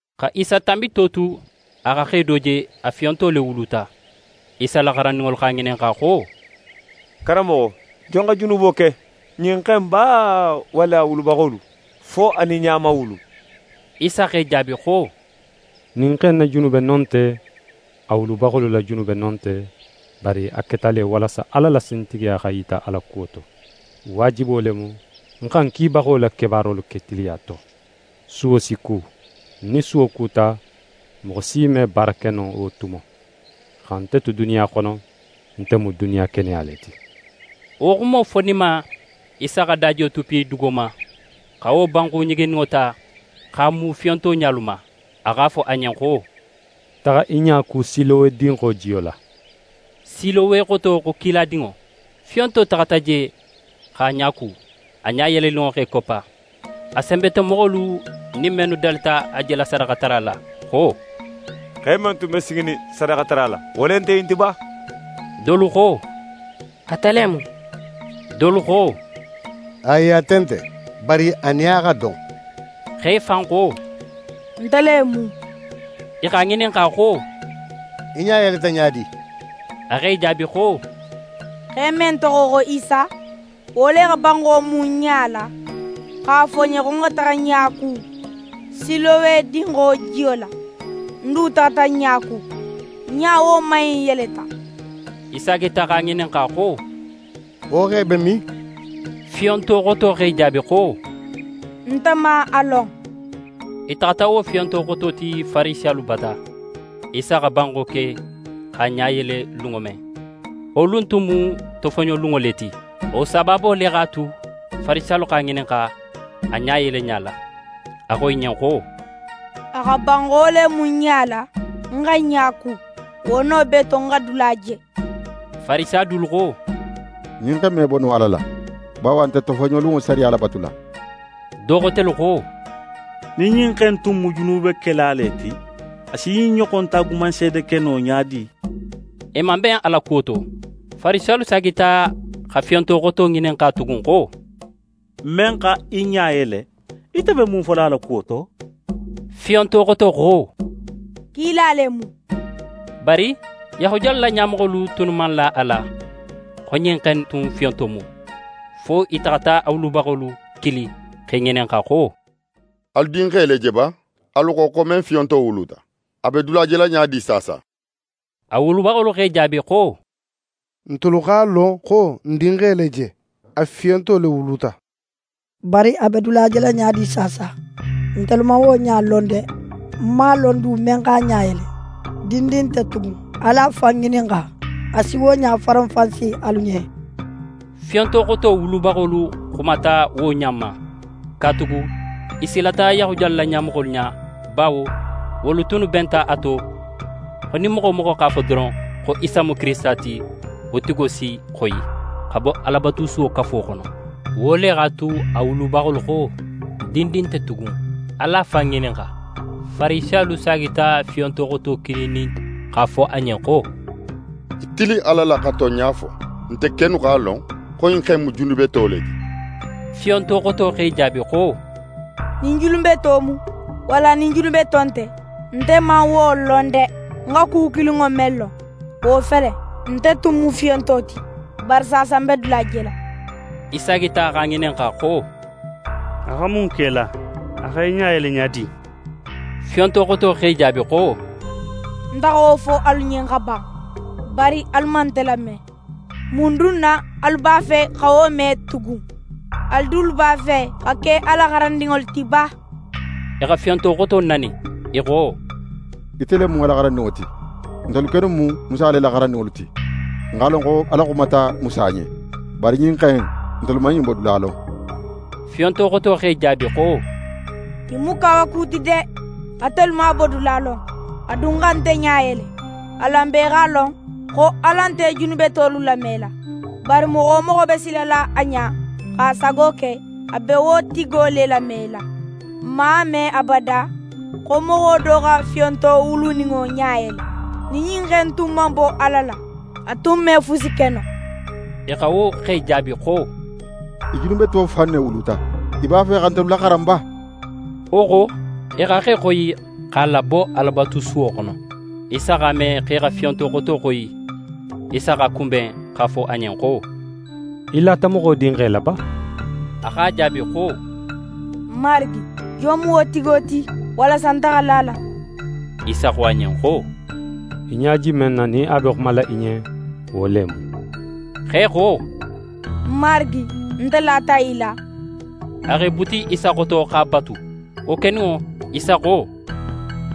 Xa Isa tanbito tu, a xa xe do je, a fiyonto le wuluta. Isa la xarandinŋolu x'a ŋininxa xo: «Karanmoxo, jon xa junubo ke? Ɲin xe in ba walla a wulubaxolu, fo a nin ɲa man wulu?» Isa x'e jaabi xo: «Ɲin xe in na junube no nte, a wulubaxolu la junube no nte, bari a keta le, walasa Ala la sintigiya xa yita a la kuwo to. Waajibo le mu, n xa ń kibaxo la kebaarolu ke tiliya to. Suwo si ku; nin suwo kuta, moxo si me baara ke no wo tumo. Xa nte tu duniya xono, nte mu duniya keneya le ti.» Wo xumo foninma, Isa xa dajiyo tuppu dugo ma, xa wo banxu ɲiginninŋo ta, x'a mu fiyonto ɲalu ma. A x'a fo a ɲen xo: «Taxa í ɲa ku Silowe dinxo jiyo la.» Silowe xoto xo «Kiladinŋo». Fiyonto taxata je, x'a ɲa ku. A ɲa yeleninŋo x'é koppa. A senbetomoxolu nin mennu dalita a jela sadaxatara la xo: «Xe men tun be siginin sadaxatara la, wo le nte ɲin ti ba?» Dolu xo: «Ate le mu.» Dolu xo: «Ayi, ate nte, bari a nin a xa don.» Xe fan xo: «Nte le mu.» I x'a ŋininxa xo: «Í ɲa yeleta ɲa di?» A x'e jaabi xo: «Xe men toxo xo Isa, wo le xa banxo mu ń ɲa la, x'a fo ń ɲen xo ń xa taxa ń ɲa ku Silowe dinxo jiyo la. Ń du taxata ń ɲa ku, ń ɲa woman in yeleta.» I saagita x'a ŋininxa xo: «Wo xe be min?» Fiyonto xoto x'e jaabi xo: «Nte man a lon.» I taxata wo fiyonto xoto ti Farisiyalu bata. Isa xa banxo ke, x'a ɲa yele lunŋo men, wo lun tun mu tofoɲolunŋo le ti. Wo sabaabo le x'a tu, Farisiyalu x'a ŋininxa, a ɲa yeleɲa la. A xo i ɲen xo: «A xa banxo le mu ń ɲa la, ń xa ń ɲa ku, wo no bee to, ń xa dula je.» Farisiya dolu xo: «Ɲin xe in me bo no Ala la, bawo a nte tofoɲolunŋo sariya labatula.» Do xotelu xo: «Nin ɲin xe in tun mu junubekela le ti, a si ɲin ɲoxon taagumanseede ke no ɲa di?» I man ben a la kuwo to. Farisiyalu saagita xa fiyonto xoto ŋininxa tugun xo: «Men xa í ɲa yele, ite be mun fola a la kuwo to?» Fiyonto xoto xo: «Kila le mu.» Bari Yahudiyalu la ɲamoxolu tunnu man la a la, xo ɲin xe in tun fiyonto mu, fo i taxata a wulubaxolu kili, x'e ŋininxa xo: «Alu dinxe le je ba, alu xo, xo men fiyonto wuluta? A be dula jela ɲa di saasa?» A wulubaxolu x'e jaabi xo: «Ntelu x'a lon xo n dinxe le je, a fiyonto le wuluta. Bari a be dula jela ɲa di saasa, ntelu man wo ɲa lon de! N man a lon du, men x'a ɲa yele. Dindin nte tugun, alu a fan ŋininxa. A si wo ɲa faranfansi alu ɲen.» Fiyonto xoto wulubaxolu xumata wo ɲa ma, katugala i silata Yahudiyalu la ɲamoxolu ɲa. Bawo wolu tunnu benta a to, xo nin moxo wo moxo x'a fo doron, xo Isa mu Kirisita ti, wo tigo si xoyi, xa bo Alabatusuwo kafo xono. Wo le x'a tu, a wulubaxolu xo: «Dindin nte tugun, alu a fan ŋininxa.» Farisiyalu saagita fiyonto xoto kilinin x'a fo a ɲen xo: «Í tilin Ala la xa tonɲa fo. Nte kennu x'a lon, xo ɲin xe in mu junubeto le ti.» Fiyonto xoto x'e jaabi xo: «Nin junubeto mu, walla nin junubeto nte, nte man wo lon de. Nte xa ku kilinŋo men lon, wo fele: Nte tun mu fiyonto ti, bari saasa ń be dula jela.» I saagita x'a ŋininxa xo: «A xa mun ke í la? A xa í ɲa yele ɲa di?» Fiyonto xoto x'e jaabi xo: «Nte xa wo fo alu ɲen xa ban, bari alu man nte lame. Mun dun na alu b'a fe xa wo me tugun? Alu dulu b'a fe xa ke a la xarandinŋolu ti ba?» I xa fiyonto xoto nani. I xo: «Ite le mu a la xarandinŋo ti! Nte kennu mu Musa le la xarandinŋolu ti. N x'a lon xo Ala xumata Musa ɲen. Bari ɲin xe in, ntelu man ɲin bodula lon!» Fiyonto xoto x'e jaabi xo: «Ɲin mu kawaku ti de: Atelu man a bodula lon, a dun xa nte ɲa yele. Alan bee x'a lon xo Ala nte junubetolu lamela. Bari moxo men be silala a ɲa, x'a sago ke, a be wo tigo le lamela. N man a me abada, xo moxo do xa fiyonto wuluninŋo ɲa yele. Nin ɲin xe in tun man bo Ala la, a tun me fusi ke no.» I xa wo xe jaabi xo: «Í junubeto fan ne wuluta. Í b'a fe xa ntelu laxaran ba?» Wo xo, i xa xe xoyi, x'a labo Alabatusuwo xono. Isa x'a me xo i xa fiyonto xoto xoyi. Isa x'a kunben x'a fo a ɲen xo: «Í lata Moxo Dinxe la ba?» A x'a jaabi xo: «Marigi, jon mu wo tigo ti, walasa nte xa la a la?» Isa xo a ɲen xo: «Í ɲa je men na, nin a be xumala í ɲen, wo le mu.» Xe xo: «Marigi, nte lata í la.» A x'é buti Isa xoto, x'a batu. Wo keninŋo, Isa xo: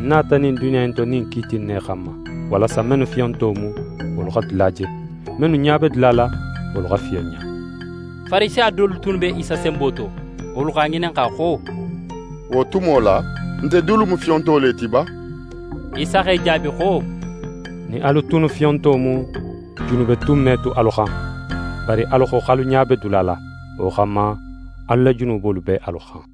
«Ń nata ɲin duniya in to ɲin kiiti in ne xanma: Walasa mennu fiyonto mu, wolu xa dula je, mennu ɲa be dula la, wolu xa fiyonɲa.» Farisiya dolu tunnu be Isa senbo to, wolu x'a ŋininxa xo: «Wo tumo la, nte dulu mu fiyonto le ti ba?» Isa x'e jaabi xo: «Nin alu tunnu fiyonto mu, junube tun me tu alu xan. Bari alu xo, x'alu ɲa be dula la. Wo xanma, alu la junubolu be alu xan».